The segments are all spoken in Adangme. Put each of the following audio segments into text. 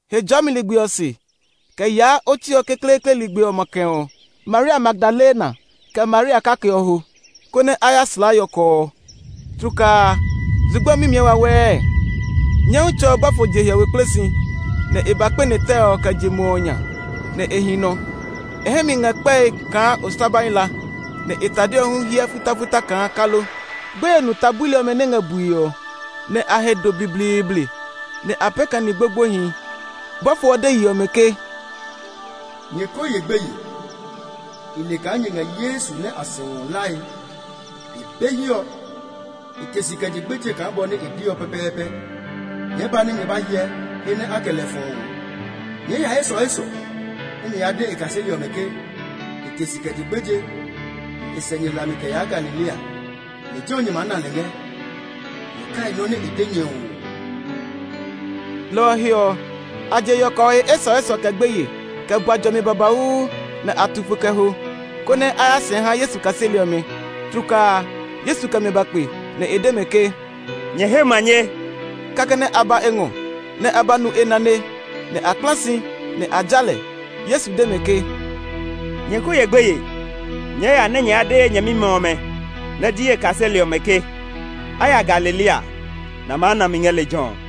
Hejɔɔmi ligbi ɔ se, kɛ yaa otsi ɔ kekleekle ligbi ɔ makɛ ɔ, Maria Magdalena, kɛ Maria kake ɔ ho, konɛ a ya slaa yɔkɔ ɔ. Tlukaa a, zugba mimiɛ wawɛɛ; Nyɔmtsɛ ɔ bɔfo je hiɔwe kple si, nɛ e ba kpɛne tɛ ɔ kɛ je muɔ ɔ nya, nɛ e hi nɔ. E hɛ mi ngɛ kpɛe kaa oslabai la, nɛ e tade ɔ hu hiɛ futafuta kaa kalo. Gbeye nu ta buli ɔmɛ nɛ ngɛ bue ɔ, nɛ a he do blibliibli, nɛ a pee kaa ni gbogboehi. Bɔfo ɔ de yi ɔmɛ ke, “Nyɛ ko ye gbeye. I le kaa nyɛ ngɛ Yesu nɛ a sɛu ɔ hlae. E be hiɛ ɔ; e te si kɛ je gbeje kaa bɔ nɛ e de ɔ pɛpɛɛpɛ. Nyɛɛ ba nɛ nyɛ ba hyɛ he nɛ a kɛ lɛ fɔ ɔ. Nyɛɛ ya esɔesɔ nɛ nyɛ ya de e kaseli ɔmɛ ke, ‘E te si kɛ je gbeje, nɛ e sɛ nyɛ hlami kɛ yaa Galilea. Lejɛ ɔ nyɛ maa na lɛ ngɛ!’ Nyɛ kai nɔ́ nɛ i de nyɛ ɔ oo!” Lɔ ɔ he ɔ, a je yɔkɔ ɔ he esɔesɔ kɛ gbeye, kɛ bua jɔmi babauu; nɛ a tu fo kɛ ho, konɛ a ya sɛɛ ha Yesu kaseli ɔmɛ. Tlukaa a, Yesu kɛ mɛ ba kpe, nɛ e de mɛ ke, “Nyɛ he manye!” Kɛkɛ nɛ a ba e ngɔ, nɛ a ba nu e nane, nɛ a kpla si, nɛ a ja lɛ. Yesu de mɛ ke, “Nyɛ ko ye gbeye! Nyɛɛ ya nɛ nyɛ ya de ye nyɛmimɛ ɔmɛ nɛ ji ye kaseli ɔmɛ ke a ya Galilea, nɛ a maa na mi ngɛ lejɛ ɔ.”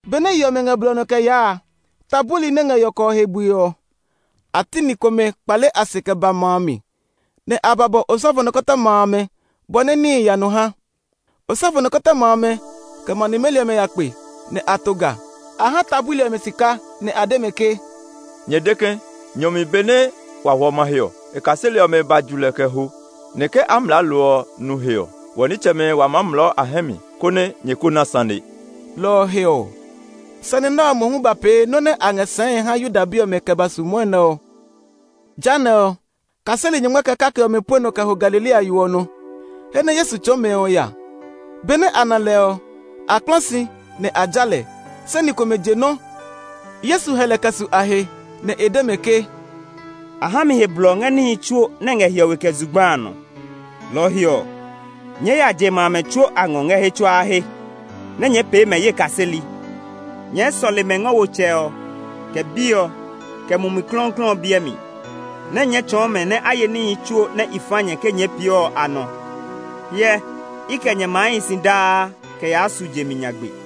Benɛ yi ɔmɛ ngɛ blɔ ɔ nɔ kɛ yaa a, ta buli nɛ ngɛ yɔkɔ ɔ he bue ɔ, a ti ni komɛ kpale a se kɛ ba ma a mi, nɛ a ba bɔ osɔfo nikɔtɔma amɛ bɔ nɛ níhi ya nɔ ha. Osɔfo nikɔtɔma amɛ, kɛ ma nimeli ɔmɛ ya kpe, nɛ a to ga. A ha ta buli ɔmɛ sika, nɛ a de mɛ ke, “Nyɛ de ke, nyɔ mi benɛ wa hwɔ mahe ɔ, e kaseli ɔmɛ ba nɛ a ba ju lɛ kɛ ho. Nɛ ke Amlaalo ɔ nu he ɔ, wɔ nitsɛmɛ wa maa mlɔɔ e hɛ mi, konɛ nyɛ ko na sane.” Lɔ ɔ he ɔ, sane nɛ ɔ mohu ba pee nɔ́ nɛ a ngɛ sɛɛe ha Yuda bi ɔmɛ kɛ ba su mwɔnɛ ɔ. Jehanɛ ɔ, kaseli nyɔngma kɛ kake ɔmɛ pue nɔ kɛ ho Galilea yo ɔ nɔ, he nɛ Yesu tsɔɔ mɛ ɔ ya. Benɛ a na lɛ ɔ, a kpla si nɛ a ja lɛ; se ni komɛ je nɔ́. Yesu hɛ lɛ kɛ su a he, nɛ e de mɛ ke, “A ha mi he blɔ ngɛ níhi tsuo nɛ ngɛ hiɔwe kɛ zugba a nɔ. Lɔ ɔ he ɔ, nyɛɛ ya je ma amɛ tsuo a ngɔ ngɛ he tsuaa he, nɛ nyɛɛ pee mɛ ye kaseli. Nyɛɛ sɔle mɛ ngɔ wo Tsɛ ɔ, kɛ Bi ɔ, kɛ Mumi Klɔuklɔu ɔ biɛ mi, nɛ nyɛɛ tsɔɔ mɛ nɛ a ye níhi tsuo nɛ i fa nyɛ ke nyɛɛ pee ɔ a nɔ. Hyɛ, i kɛ nyɛ maa hi si daa kɛ yaa su je mi nyagbe.”